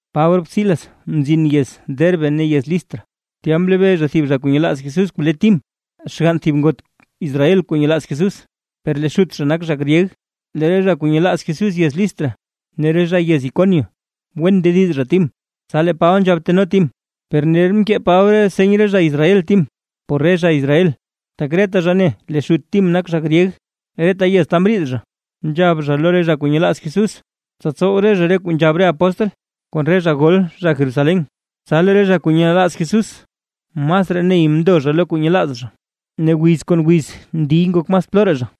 Paba rop Silas mzin yez Derbe ne yez Listra, tya mlebee zha thib zha kuu nyelaaz Jesús kuu le Tim, xgann thib ngot Israel kuu nyelaaz Jesús, per lee xut zha nak zha gryeg. Lee re zha kuu nyelaaz Jesús yez Listra ne re zha yez Iconio wen ndediz zha Tim. Tsa lee Paba nzhab teno Tim, per ner mkee Paba seny re zha Israel Tim, por re zha Israel, tak reta zha ne lee xut Tim nak zha gryeg. Reta yez ta mriid zha nzhab zha lo re zha kuu nyelaaz Jesús, tsa tsow re zha re kuu nzhab re apóstl kon re zha gol zha Jerusalén. Tsa lee re zha kuu nyelaaz Jesús masraa ney mndo zha lo kuu nyelaaz zha, ne wiz kon wiz ndiy ngok mas ploraa zha.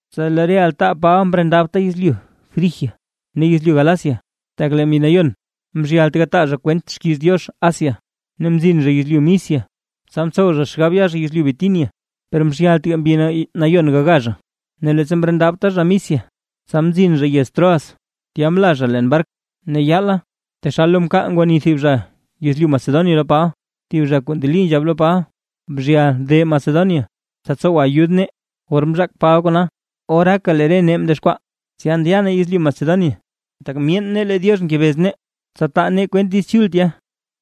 Tsa lee re altaa Paba mriidabta yezlyu Frigia ne yezlyu Galacia, tak lee Mbi Nayon mzhyalt gataa zha kwent xkiiz Diox Asia, ne mzin zha yezlyu Misia. Tsa mtsow zha xgab ya zha yezlyu Bitinia, per mzhyaltga Mbi Nayon gaga zha. Ne leettsa mriidabta zha Misia, tsa mzin zha yez Troas, tya mla zha leen bark. Ne yaala taxal lo mkaal ngwani thib zha yezlyu Macedonia lo Paba, thib zha kuu ndeli nzhab lo Paba: “Bzhyal de Macedonia tsa tsowa ayud nee”. Or mzhaak Paba kona, oraaka lee re nee mdexkwaa, tsa ndya nee yezlyu Macedonia, tak myeen nee lee Diox ngebez nee, tsa taa nee kwent Diiz Chul tya.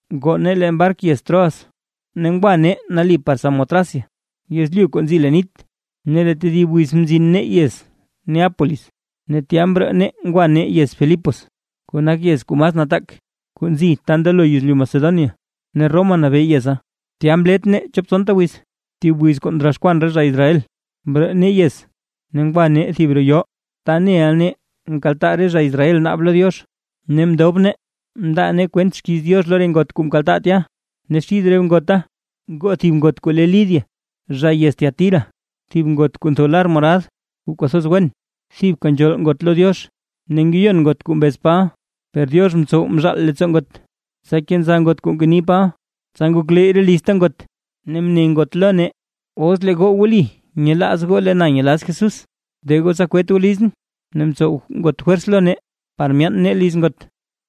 Ngoo nee leen bark yez Troas ne ngwa nee nali par Samotracia yezlyu kuu nzi leen nit, ne lee tedib wiz mzin nee yez Neápolis. Ne tya mroo nee ngwa nee yez Filipos, kuu nak yez kuu mas nataak, kuu nzi ta ndelo yezlyu Macedonia ne Roma nabee yeza. Tya mlet nee chop tsonta wiz. Thib wiz kuu ndroxkwan re zha Israel, mroo nee yez ne ngwa nee thib roo yoo, ta neʼa nee nkaltaa re zha Israel naab lo Diox, ne mndob nee mndaa nee kwent xkiiz Diox lo re ngot kuu mkaltaa tya. Ne xid re ngota ngoo thib ngot kuu le Lidia zha yez Tiatira, thib ngot kuu ntho lar morad kuu kwathoz wen, thibka nzhool ngot lo Diox, ne ngeyon ngot kuu mbez Paba per Diox mtsow mzhaal leettsoo ngot, tsa kenza ngot kuu ngeni Paba. Tsa ngokleyy re lizta ngot, ne mne ngot lo nee: ―Os lee goo wli nyelaaz goo lee na nyelaaz Jesús, de goo tsa kwet goo lizʼn. Ne mtsow ngot fwers lo nee par myaan nee liz ngot.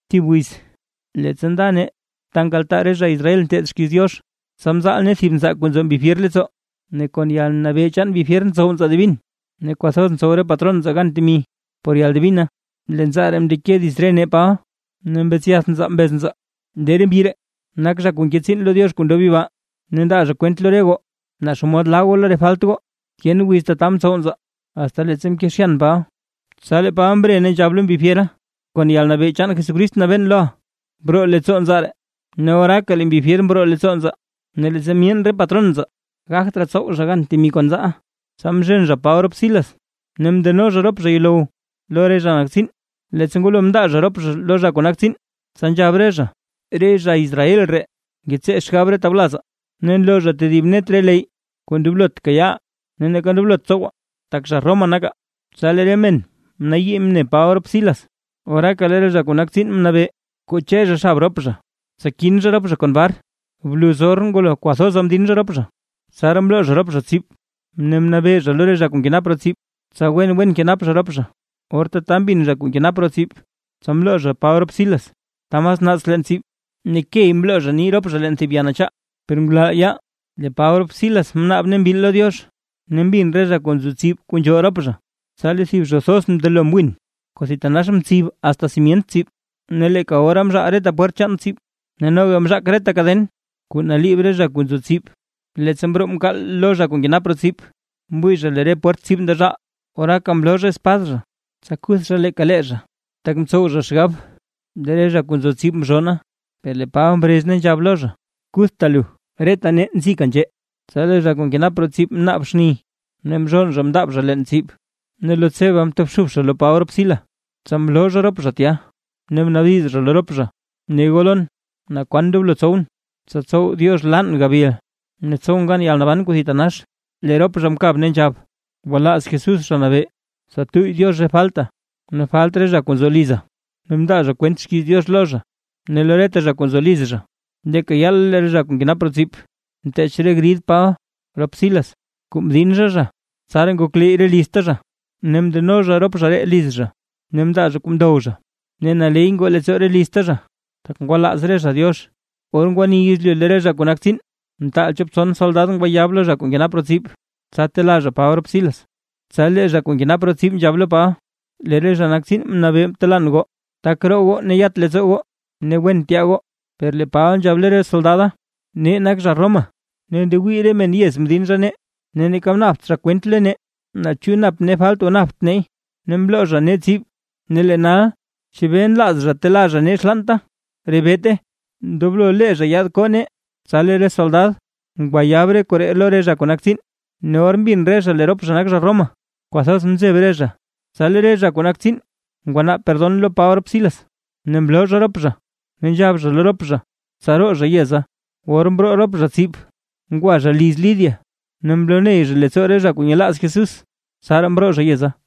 Thib wiz Leettsa nda nee ta nkaltaa re zha Israel nteed xkiiz Diox, tsa mzal nee thib nzaa kuu nzo mbi fyer leettsoo, ne kon yalnabee chaan mbi fyer ntsow nzaa divin, ne kwathoz ntsow re patron nzaa gan temi por yaldivina. Lee nzaa ree mndeke dits re nee Paba ne mbetsyath nzaa mbez nzaa: ―¡Lee re mbyi ree nak zha kuu nke tsiin lo Diox kuu ndob yibaa, ne ndaa zha kwent lo re goo naa xomod laa goo lo re falt goo! Tyen wiz tata mtsow nzaa, asta leettsa mkezhyan Paba, tsa lee Paba mre ne nzhab lo mbi fyera: ―Kon yalnabee chaan Jesucrist nabeen loʼa, broo leettsoo nzaa ree. Ne oraaka lee mbi fyer mroo leettsoo nzaa. Per leettsa myeen re patron nzaa, gagt raa tsow re zha gan temi kon nzaaʼa, tsa mzhen zha Paba rop Silas ne mndeno zha rop zha yuulow lo re zha nak tsiin. Leettsa ngwalo mndaa zha rop zha lo zha kuu nak tsiin, tsa nzhab re zha: ―Re zha Israel ree ngetsee xgab re tawlazaa. Ne nloo zha tedib net re leyy kuu ndoblot kayaaʼaa ne neeka ndoblot tsowaa, tak zha Roma nakaa. Tsa lee re men mnayii mne Paba rop Silas, oraaka lee re zha kuu nak tsiin mnabee, koche zha xab rop zha, tsa kin zha rop zha kon bar. Bluz or ngwalo kwathoza mdin zha rop zha, tsaraa mloo zha zha tsib, ne mnabee zha lo re zha kuu nkenap roo tsib, tsa wen wen kenap zha rop zha. Or tata mbin zha kuu nkenap roo tsib, tsa mloo zha Paba rop Silas ta mas naats leen tsib, ne key mloo zha nii rop zha leen thib le ya nachaa. Per ngulal yaal lee Paba rop Silas mnaab ne mbil lo Diox, ne mbin re zha kuu nzo tsib kuu nzhool rop zha. Tsa lee thib zho thoz mndelo mwin kuu thitanax mtsib asta simyent tsib. Ne leeka ora mzhaal reta pwert chaan tsib ne noga mzhak reta kaden kuu naliib re zha kuu nzo tsib. Leettsa mroo mkaal lo zha kuu nkenap roo tsib, mwii zha lee re pwert tsib ndezhaal, oraaka mloo zha espad zha, tsa kuth zha leeka lee zha, tak mtsow zha xgab lee re zha kuu nzo tsib mzhonna. Per lee Paba mrez ne nzhab lo zha: ―¡Kuthta lu, reta nee nzika nzhee! Tsa lee zha kuu nkenap roo tsib mnaab xni, ne mzhonn zha mndaab zha leen tsib, ne lo tseba mtobxub zha lo Paba rop Silas. Tsa mloo zha rop zha tya ne mnaabdiz zha lo rop zha: ―Ne goo lon, ¿naa kwan ndoblo tsowʼn, tsa tsow Diox laan gabil ne tsowʼn gan yalnaban kuu thitanax? Lee rop zha mkab, ne nzhab: ―Gwalaaz Jesús Zha Nabee, tsa tuyy Diox re falta ne falt re zha kuu nzo liza. Ne mndaa zha kwent xkiiz Diox lo zha ne lo reta zha kuu nzo liz zha. Leeka yaala lee zha kuu nkenap roo tsib, mteech re grid Paba rop Silas kuu mdin zha zha, tsaraa ngokleyy re lizta zha. Ne mndeno zha rop zha ree liz zha ne mndaa zha kuu ndow zha, ne naley ngoo leettsoo re lizta zha, tak ngwalaaz re zha Diox. Or ngwani yezlyu lee re zha kuu nak tsiin, mtaal chop tson soldad ngwayab lo zha kuu nkenap roo tsib, tsa telaa zha Paba rop Silas. Tsa lee zha kuu nkenap roo tsib nzhab lo Paba: ―Lee re zha nak tsiin mnabee telaan goo; taka roo goo ne yat leettsoo goo ne wen tyaa goo. Per lee Paba nzhab lo re soldada: ―¡Nee nak zha Roma! Ne ndewii re men yez mdin zha nee, ne neeka mnaabt zha kwent lo nee naa chu nap nee falt o napt neey, ne mloo zha nee tsib. Ne lee nal, ¿chebee nlaaz zha telaa zha nee xlaanta? ¡Rebeete! Ndoblo lee zha yaad koo nee. Tsa lee re soldad ngwayab re koree lo re zha kuu nak tsiin, ne or mbin re zha lee rop zha nak zha Roma, kwathoz mzeb re zha. Tsa lee re zha kuu nak tsiin ngwanaab Perdon lo Paba rop Silas, ne mloo zha rop zha ne nzhab zha lo rop zha, tsa roo zha yeza. Or mroo rop zha tsib ngwa zha liz Lidia, ne mloney zha leettsoo re zha kuu nyelaaz Jesús, tsaraa mroo zha yeza.